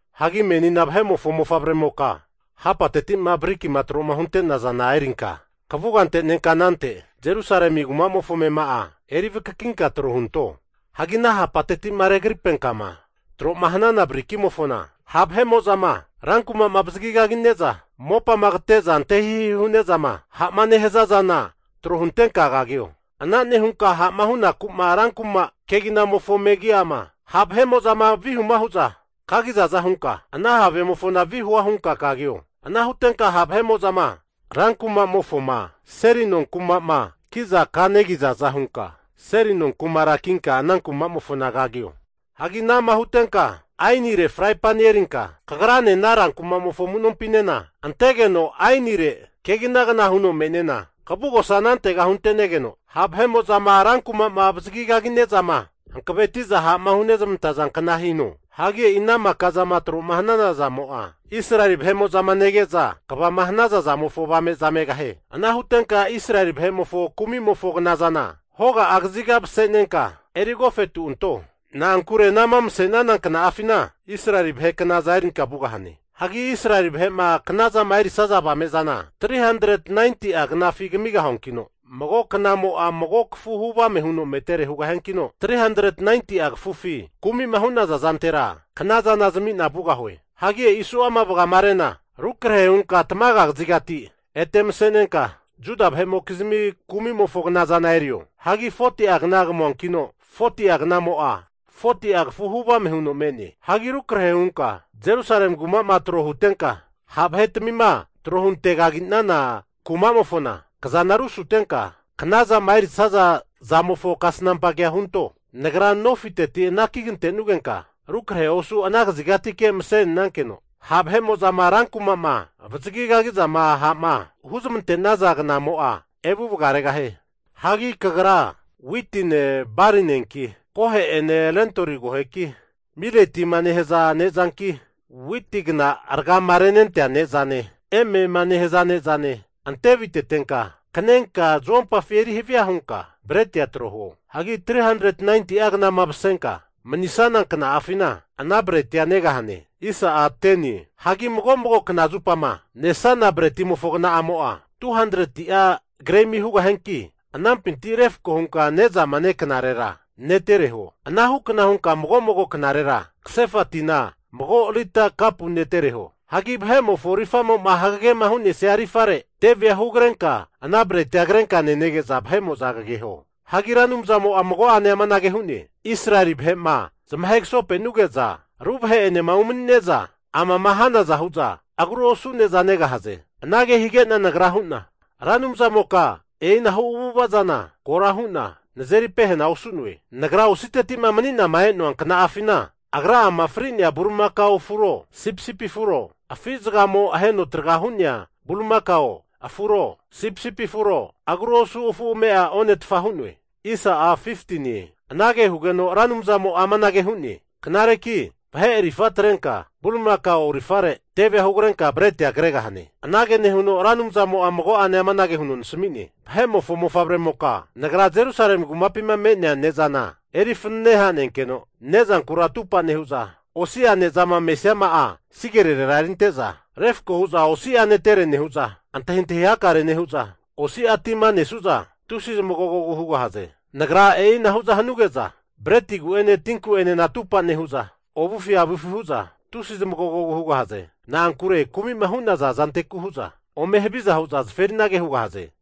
Hagi menina vahe'mofo mofavremoka hapateti'ma brikima tro'ma hunte'nazana erinka kavuga antenenka anante Jerusalemi rankumamofo amema'a eri vakakinka tro hunto. Hagi ana hapateti'ma regripenkama tro'ma hanana brikimofona ha' vahe'mo'zama rankuma'ma avazagi kagine'za mopama kate'za ante hihi hu'ne'zama ha'ma nehaza zana tro huntenka kagio. Ana nehunka ha'ma hunaku'ma rankuma keginamofo megi'ama ha' vahe'mo'zama vihuma hu'za kanegizaza hunka, ana havemofona vihua hunka kagio. Ana hutenka ha' vahe'mo'zama rankumamofoma seli nonkuma'ma kiza kanegizaza hunka seli nonkumara kinka ana kumamofona kagio. Hagi ana'ma hutenka ainire fraipani erinka kagrane ana rankumamofo amu'nompinena antegeno ainire keginagna huno me'nena kavugosa anantega huntenegeno, ha' vahe'mo'zama rankuma'ma avazagi kagine'zama hankaveti'za ha'ma hunezmanta zankna hino. Hagi e'i ana maka zama tro'ma hanana zamo'a, Israeli vahe'mo'zama nege'za kvama hanaza zamofo avame'za megahie. Ana hutenka Israeli vahe'mofo kumimofo knazana hoga kaziga'a mase'nenka eri agofetu anto. Na'ankure anama mase'nana kna'afina Israeli vahe knaza erinka vugahane. Hagi Israeli vahe'ma knazama erisaza avame'zana 390'a knafi kamigahuankino, mago knamo'a mago kafu huvame huno metere hugahiankino, 390'a kafufi kumi'ma hu'naza zantera knazana zami'na vugahue. Hagi e'i su'ama vagamarena rukrahe hunka tamaga kazigati ete mase'nenka, Juda vahe'mokizmi kumimofo knazana erio. Hagi 40'a kna kamuankino, 40'a knamo'a 40'a kafu huvame huno me'ne. Hagi rukrahe hunka Jerusalemi kuma'ma tro huntenka, ha' vahetamima trohunte kaginte'nana kumamofona kazana rusutenka knazama erisaza zamofo kasnampa kea hunto. Nagra nofiteti anaki kantenugenka rukrahe osu ana kazigatike mase'nenankeno, ha' vahe'mo'zama rankuma'ma avazagizama ha'ma huzmante'naza knamo'a evu vagaregahie. Hagi kagra witine balinenki, kohe'ene lentoli koheki, miletiema nehaza ne'zanki witigna ragama renentea ne'za emema nehaza ne'zane ante avitetenka kanenka zuompafi eri havia hunka bretia tro huo. Hagi 390'a knama masenka manisana kna'afina ana bretia negahane. Hagi mago mago kna zupama nesana bretimofo kna'amo'a, 200'a gremi hugahianki anampinti refko hunka nezama neknarera netere huo. Ana hukna hunka mago mago knarera kasefa tina mago lita kapu netere huo. Hagi vahe'mofo rifamo'ma hagegema hu'nesia rifare, tevea hugrenka ana bretia krenka nenege'za vahe'mo'za kageho. Hagi Ra Anumzamo'a mago'ane amanage hu'ne, Israeli vahe'ma zamahegasopenuge'za ru vahe'enema umani'neza, amama hanaza hu'za agru osu ne'za negahaze. Anage hige'na nagra hu'na, Ra Anumzamoka e'inahu avu'ava zana kora hu'na nazeri pehena osu'noe. Nagra ositeti'ma mani'nama e'noa kna'afina agra'ama fri'nea bulimakao afuro sipisipi afuro, afi zagamo aheno traga hu'nea bulimakao afuro sipisipi afuro, agru osu afu ame'a onetfa hu'noe. Anage hugeno Ra Anumzamo'a amanage hu'ne, Knareki vahe rifa atrenka bulimakao rifare tevea hugrenka bretia kregahane. Anage nehuno Ra Anumzamo'a mago'ane amanage huno nasmi'ne, Vahe'mofo mofavremoka, Nagra Jerusalemi kumapima me'nea ne'zana eri fanene hanenkeno, nezankura atupa nehu'za osi'a nezama mesiama'a sigerirera erinte'za refko huza osi'a netere nehu'za antahintahi hakare nehu'za, osi'a tima nesu'za tusi zamagogogu hugahaze. Nagra e'inahu'za hanuge'za bretigu'ene tinku'enena atupa nehu'za, ovufi avufi hu'za tusi zmagogogu hugahaze. Na'ankure kumi'ma hu'naza zanteku hu'za ome haviza hu'za zaferinage hugahaze.